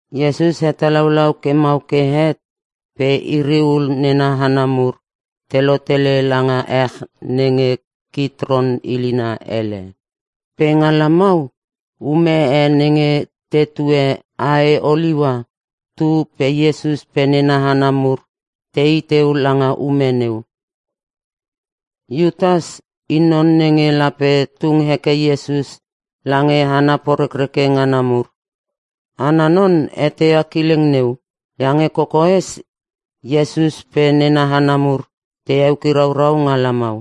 Iesus hetalaulau ke mau ke het pe iri ul nena hana mur te lotele langa ech nenge Kitron ilina ele. Pe nga lamau ume e nenge te tue ae oliua tu pe Iesus pe nena hana mur tei teu langa ume neu. Iutas i non nenge lape tung heke Iesus lange hana porekreke ngana mur. Ana non eteia kileng neu iange kokoes Iesus pe nena hana mur te eukiraurau nga lamau.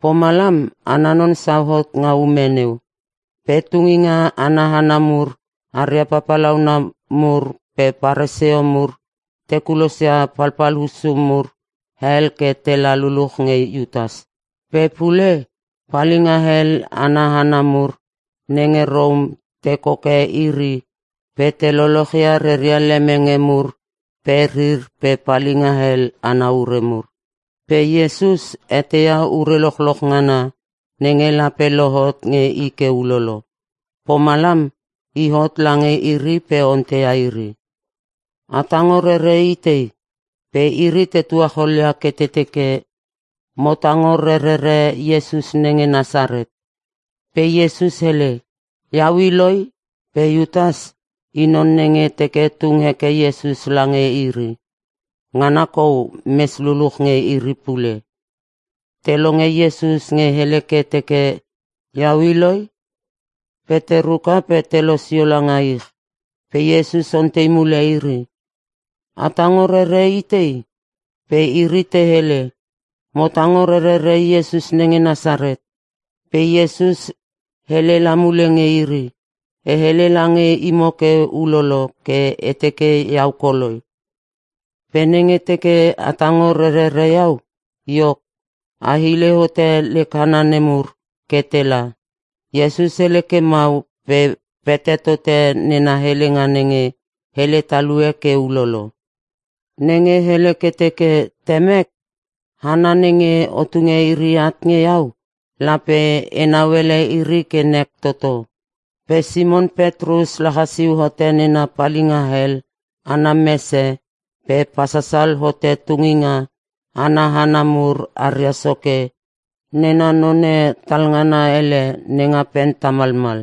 Pomalam ana non sauhot nga ume neu. Pe tunginga ana hana mur aria papalauna mur pe Paresio mur te kulosia palpal hussu mur hel ke tela luluch nge Iutas. Pe pule, palinga hel ana hana mur nenge Rom te koke iri pe te lochloch ia reria lemenge mur pe rir pe palinga hel ana ure mur. Pe Iesus eteia ure lochloch ngana nenge lape lohot nge i ke ulolo. Pomalam i hot lange iri pe onteia iri, “A tango rere itei?” Pe iri te tuacholia ke te teke, “Mo tango rerere Iesus nenge Nasaret.” Pe Iesus hele, “Iau i loi.” (Pe Iutas i non nenge teke tung heke Iesus lange iri. Ngana kou mes luluch nge iri pule.) Te longe Iesus nge hele ke teke, “Iau i loi.” Pe te ruka pe te losio langa ich. Pe Iesus ontei mule iri, “A tango rere itei?” Pe iri te hele, “Mo tango rerere Iesus nenge Nasaret.” Pe Iesus hele la mule nge iri, “E hele lange imo ke ulolo ke e teke iau koloi. Pe nenge teke a tango rerere iau, iok a hile hote lek hana nemur ke tela.” (Iesus hele ke mau pe pete tote nena helenga nenge hele talue ke ulolo. Nenge hele ke teke, “Temek, hana nenge o tunge iri at nge iau lape enau ele iri ke nek toto.”) Pe Simon Petrus lachasiu hote nena palinga hel mese pe pasasal hote tunginga ana hana mur aria soke nena none talngana ele nenga pen tamalmal.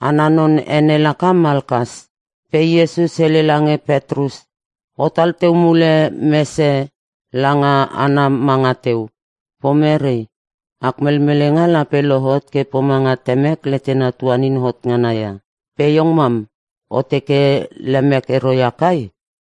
(Ana non ene laka Malkas.) Pe Iesus hele lange Petrus, “Otal teu mule mese langa ana manga teu! Pomerei, ak melmelenga lape lohot ke pomanga Temek letena tuanin hot ngana ia. Pe iong mam o teke lemek ero ia kai?”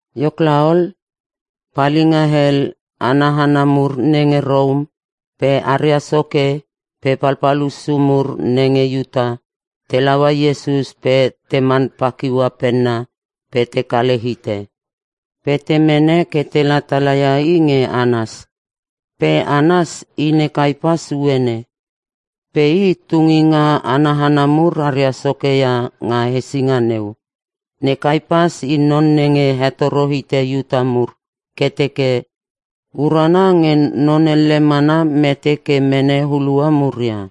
Iok laol, Palinga hel ana hana mur nenge Rom (pe aria soke) pe palpal hussu mur nenge Iuta te laua Iesus pe teman pakiua penna pe te kale hite. Pe te mene ke tela tala ia i nge Anas. Pe Anas i ne Kaipas uene. Pe i, tunginga ana hana mur aria soke ia nga hesinga neu. Ne Kaipas i non nenge hetoro hite Iuta mur ke teke, “Urana nge non elle mana mete ke mene hulua muria.”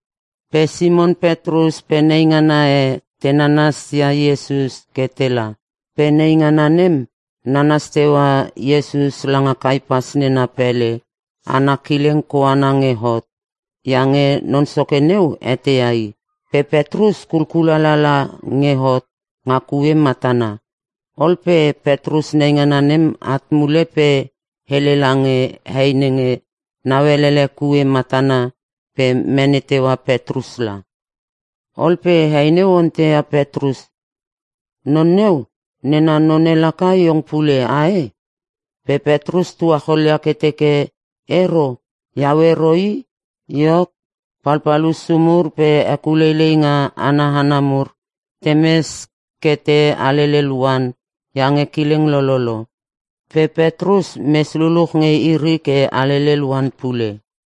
Pe Simon Petrus pe neingana e te nanasia Iesus ke tela. Pe neingana nem nanas teua Iesus langa Kaipas nena pele ana kileng koana nge hot iange non soke neu eteia i. Pe Petrus kulkulala nge hot nga kue matana. Ol pe Petrus neingana nem at mule pe hele lange hei nenge nauelele kue matana pe mene teua Petrus la. Ol pe hei neu onteia Petrus, “Non neu nena none laka iong pule, ae?” Pe Petrus tuacholia ke teke, “Ero! iau ero i!” Iok, palpal hussu mur pe hekuleileinga ana hana mur temes ke te alelel oan iange kileng lololo. Pe Petrus mes luluch nge iri ke alelel oan pule.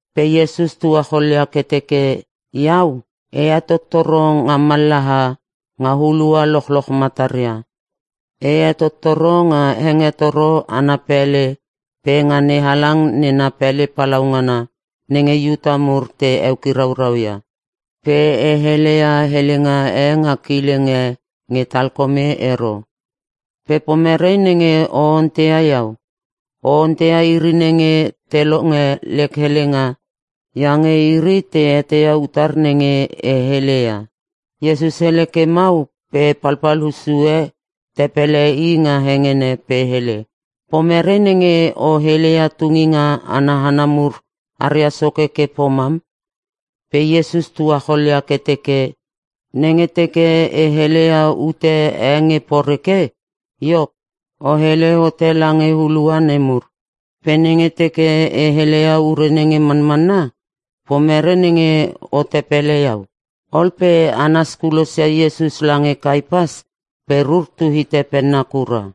Pe Iesus tuacholia ke teke, “Iau, e hetottoro nga mallaha nga hulua lochloch mataria. E hetottoro nga hengetoro ana pele pe nga NeHalang nena pele palaungana nenge Iuta mur te eukiraurau ia. Pe e heleia helenga e nga kileng e nge talkome ero. Pe pomerei nenge o onteia iau? O onteia iri nenge te longe lek helenga iange iri te eteia utar nenge e heleia.” Iesus hele ke mau pe palpal hussu e tepele i nga hengene pe hele, “Pomerei nenge o heleia tunginga ana hana mur aria soke ke pomam?” Pe Iesus tuacholia ke teke, “Nenge teke e heleia ute e nge poreke iok, o hele hote lange hulua nemur. Pe nenge teke e heleia ure nenge manmanna, pomerei nenge o tepele iau?” Ol pe Anas kulosia Iesus lange Kaipas pe rur tu hite penna kura.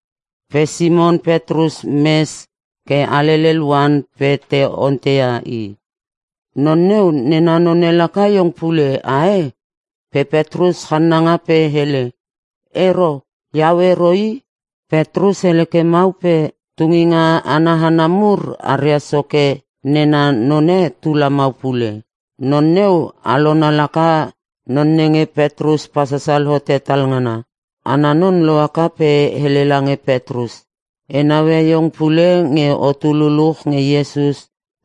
Pe Simon Petrus mes ke alelel oan pe te onteia i, “Non neu nena none laka iong pule, ae?” Pe Petrus channanga pe hele, “Ero, iau ero i.” Petrus hele ke mau pe tunginga ana hana mur aria soke nena none tu lamau pule. Non neu alona laka non nenge Petrus pasasal hote talngana. Ana non lohaka pe hele lange Petrus, “E naue iong pule nge otu luluch nge Iesus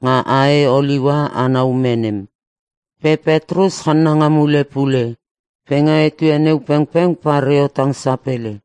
nga ae oliua ana ume nem.” Pe Petrus channanga mule pule. Pe nga etue neu pengpeng pareo tang sapele.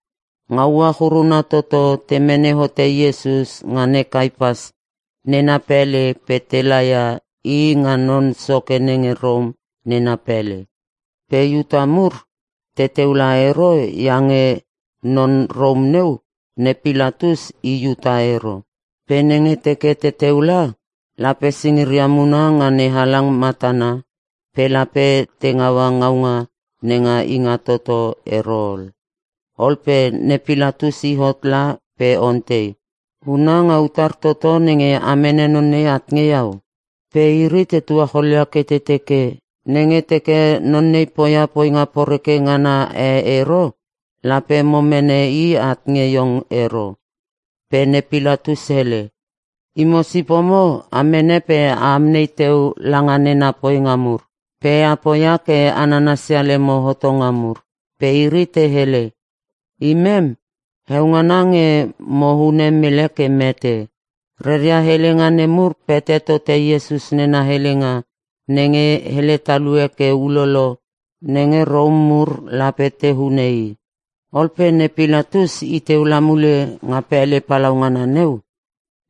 Nga uach uruna toto te mene hote Iesus nga ne Kaipas nena pele pe te laia i nga non soke nenge Rom nena pele. Pe Iuta mur teteu la ero iange non Rom neu, ne Pilatus, i Iuta ero. Pe nenge te teke teu la lape singiria muna nga NeHalang matana pe lape te ngaua ngaunga nenga Ingatoto ero ol. Ol pe ne Pilatus i hot la pe ontei, “Huna nga utar toto nenge a mene non nei at nge iau?” Pe iri te tuacholia ke te teke, “Nenge teke non nei poia poinga poreke ngana e ero lape mo mene i at nge iong ero.” Pe ne Pilatus hele, “Imo sipomo a mene pe a amnei teu langa nena poinga mur. Pe a poia ke a nanasia lemo hotonga mur.” Pe iri te hele, “Imem, heo ngana nge mo hune mele ke mete.” Reria helenga nemur pete tote Iesus nena helenga nenge hele talue ke ulolo nenge Rom mur lape te hune i. Ol pe ne Pilatus i teu la mule nga pele palaungana neu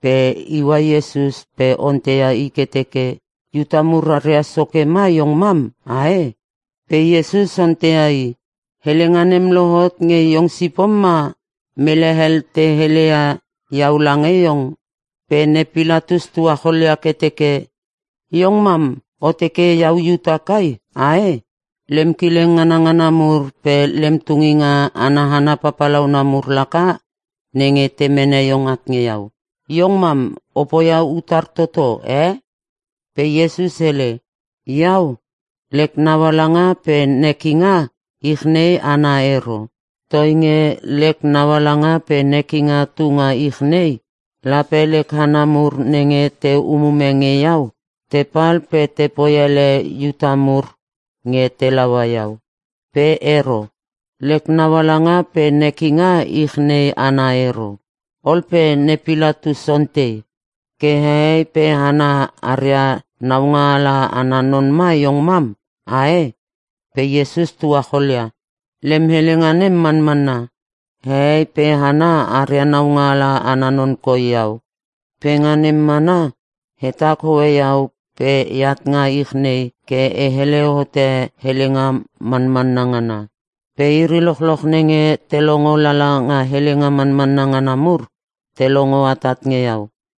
pe iua Iesus pe onteia i ke teke, “Iuta mur aria soke ma iong mam ae?” Pe Iesus onteia i, “Helenga nem lohot nge iong sipom ma mele hel te heleia iau lange iong?” Pe ne Pilatus tuacholia ke teke, “Iong mam o teke iau Iuta kai ae? Lem kileng nganangana mur pe lem tunginga ana hana papalauna mur laka nenge te mene iong at nge iau. Iong mam o poia utar toto e?” Pe Iesus hele, “Iau, lek naualanga pe nekinga ich nei ana ero. Toinge lek naualanga pe nekinga tunga ich nei lape lek hana mur nenge te umume nge iau, tepal pe poi ele Iuta mur nge te laua iau. Pe ero. Lek naualanga pe nekinga ich nei ana ero.” Ol pe ne Pilatus ontei, “Ke hehei pe hana aria naungaala ana non ma iong mam ae!?” Pe Iesus tuacholia, “Lem helenga nem manmanna. Hehei pe hana aria naungaala ana non koi iau. Pe nga nem mana hetak hoe iau pe eat nga ich nei ke e hele hote helenga manmanna ngana. Pe iri lochloch nenge te longo lala nga helenga manmanna ngana mur te longo atat nge iau.”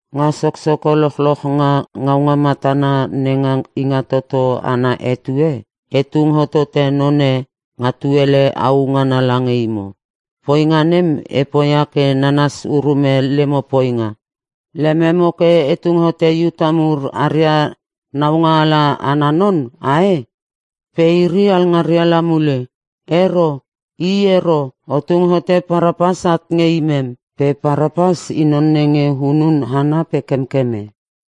Nga soksoko lochloch nga ngaunga matana nenga Ingatoto ana etue, e tung hotote none nga tuele au ngana lange imo. Poinga nem e poia ke nanas urume lemo poinga. Lememo ke e tung hote Iuta mur aria naungaala ana non, ae?” Pe iri alngaria la mule, “Ero, i ero! O tung hote Parapas at nge imem!” Pe Parapas i non nenge hunun hana pe kemkeme.